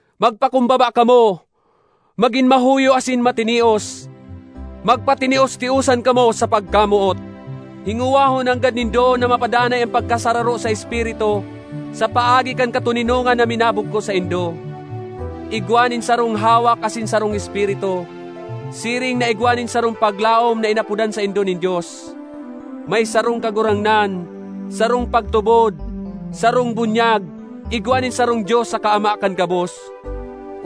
Magpakumbaba kamo, magin mahuyo asin matinios; magpatinios-tiosan kamo sa pagkamoot. Hingowahon nanggad nindo na mapadanay an pagkasararo sa Espiritu sa paagi kan katoninongan na minabugkos saindo. Igwa nin sarong hawak asin sarong Espiritu, siring na igwa nin sarong paglaom na inapodan saindo nin Dios. May sarong Kagurangnan, sarong pagtubod, sarong bunyag; igwa nin sarong Dios saka Ama kan gabos.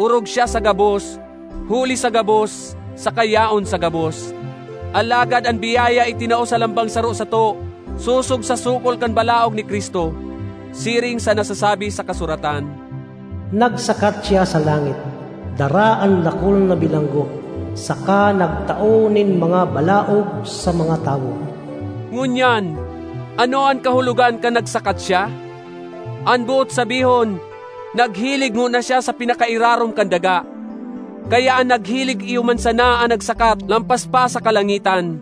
Orog siya sa gabos, huli sa gabos, saka yaon sa gabos. Alagad an biyaya itinao sa lambang saro sato sosog sa sukol kan balaog ni Cristo. Siring sa nasasabi sa kasuratan, “Nagsakat siya sa langit, dara an dakul na bilanggo, saka nagtao nin mga balaog sa mga tawo.” Ngunyan, ano an kahulogan kan “nagsakat siya”? An boot sabihon, naghilig ngona siya sa pinakairarom kan daga. Kaya an naghilig iyo man sana an nagsakat lampas pa sa kalangitan,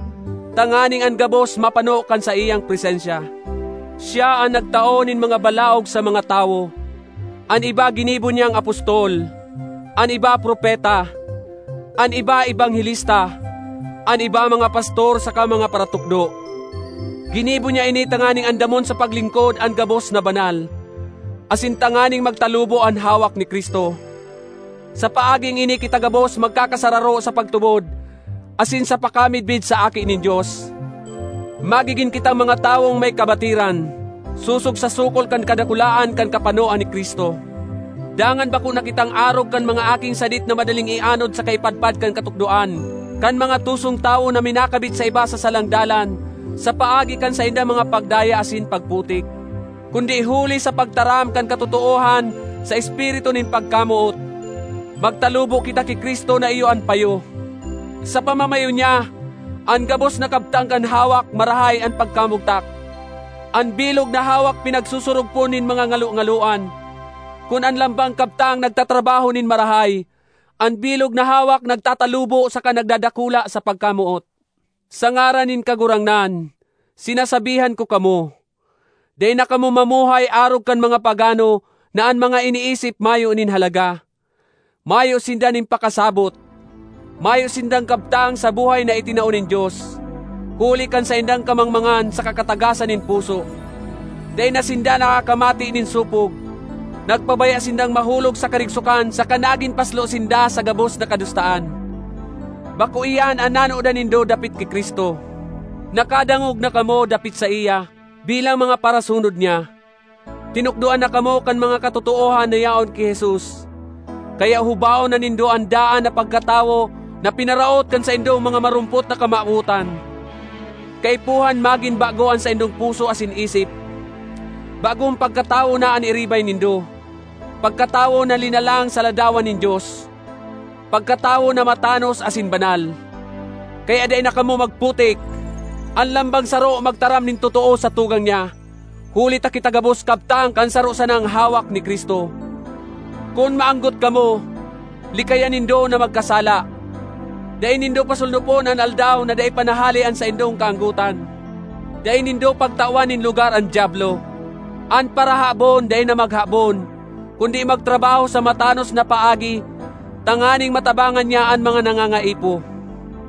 tanganing an gabos mapano kan saiyang presensya. Siya an “nagtao nin mga balaog sa mga tawo.” An iba ginibo niyang apostol, an iba propeta, an iba ebanghelista, an iba mga pastor saka mga paratukdo. Ginibo niya ini tanganing andamon sa paglingkod an gabos na banal, asin tanganing magtalubo an hawak ni Cristo. Sa paaging ini kita gabos magkakasararo sa pagtubod asin sa pakamidbid sa Aki nin Dios. Magigin kitang mga tawong may kabatiran, sosog sa sukol kan kadakulaan kan kapanoan ni Cristo. Dangan bako na kitang arog kan mga aking sadit na madaling ianod saka ipadpad kan katukdoan kan mga tusong tawo na minakabit sa iba sa salang dalan sa paagi kan saindang mga pagdaya asin pagputik. Kundi, huli sa pagtaram kan katotoohan sa espiritu nin pagkamoot, magtalubo kita ki Cristo na iyo an payo. Sa pamamayo niya, an gabos na kabtang kan hawak marahay an pagkamugtak; an bilog na hawak pinagsusurugpon nin mga ngalongaloan. Kun an lambang kabtang nagtatrabaho nin marahay, an bilog na hawak nagtatalubo saka nagdadakula sa pagkamoot. Sa ngaran nin Kagurangnan, sinasabihan ko kamo: dai na kamo mamuhay arog kan mga pagano na an mga iniisip mayo nin halaga; mayo sinda nin pakasabot. Mayo sindang kabtang sa buhay na itinao nin Dios, huli kan saindang kamangmangan saka katagasan nin puso. Dai na sinda nakakamate nin sopog; nagpabaya sindang mahulog sa karigsokan saka nagin paslo sinda sa gabos na kadustaan. Bako iyan an nanodan nindo dapit ki Cristo! Nakadangog na kamo dapit saiya; bilang mga parasunod niya, tinukdoan na kamo kan mga katotoohan na yaon ki Jesus. Kaya hubaon na nindo an daan na pagkatawo na pinaraot kan saindong mga marumpot na kamawotan. Kaipuhan magin bago an saindong puso asin isip. Bagong pagkatawo na an iribay nindo, pagkatawo na linalang sa ladawan nin Dios, pagkatawo na matanos asin banal. Kaya dai na kamo magputik! An lambang saro magtaram nin totoo sa tugang niya, huli ta kita gabos kabtang kan saro sanang hawak ni Cristo. Kun maanggot kamo, likayan nindo na magkasala; dai nindo pasolnopon an aldaw na dai pa nahale an saindong kaanggotan. Dai nindo pagtawan nin lugar an Diablo. An parahabon dai na maghabon, kundi magtrabaho sa matanos na paagi tanganing matabangan niya an mga nangangaipo.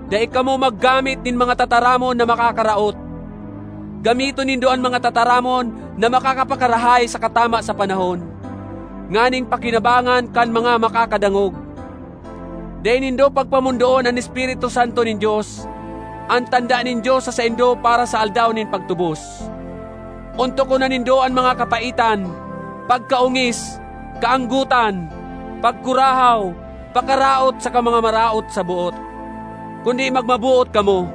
Dai kamo maggamit nin mga tataramon na makakaraot, gamiton nindo an mga tataramon na makakapakarahay saka tama sa panahon, nganing pakinabangan kan mga makakadangog. Dai nindo pagpamondoon an Espiritu Santo nin Dios, an tanda nin Dios sa saindo para sa Aldaw nin pagtubos. Ontokon na nindo an mga kapaitan, pagkaongis, kaanggotan, pagkurahaw, pakaraot saka mga maraot sa boot. Kundi magmaboot kamo,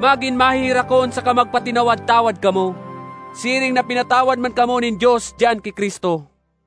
magin maheherakon saka magpatinawad-tawad kamo, siring na pinatawad man kamo nin Dios diyan ki Cristo.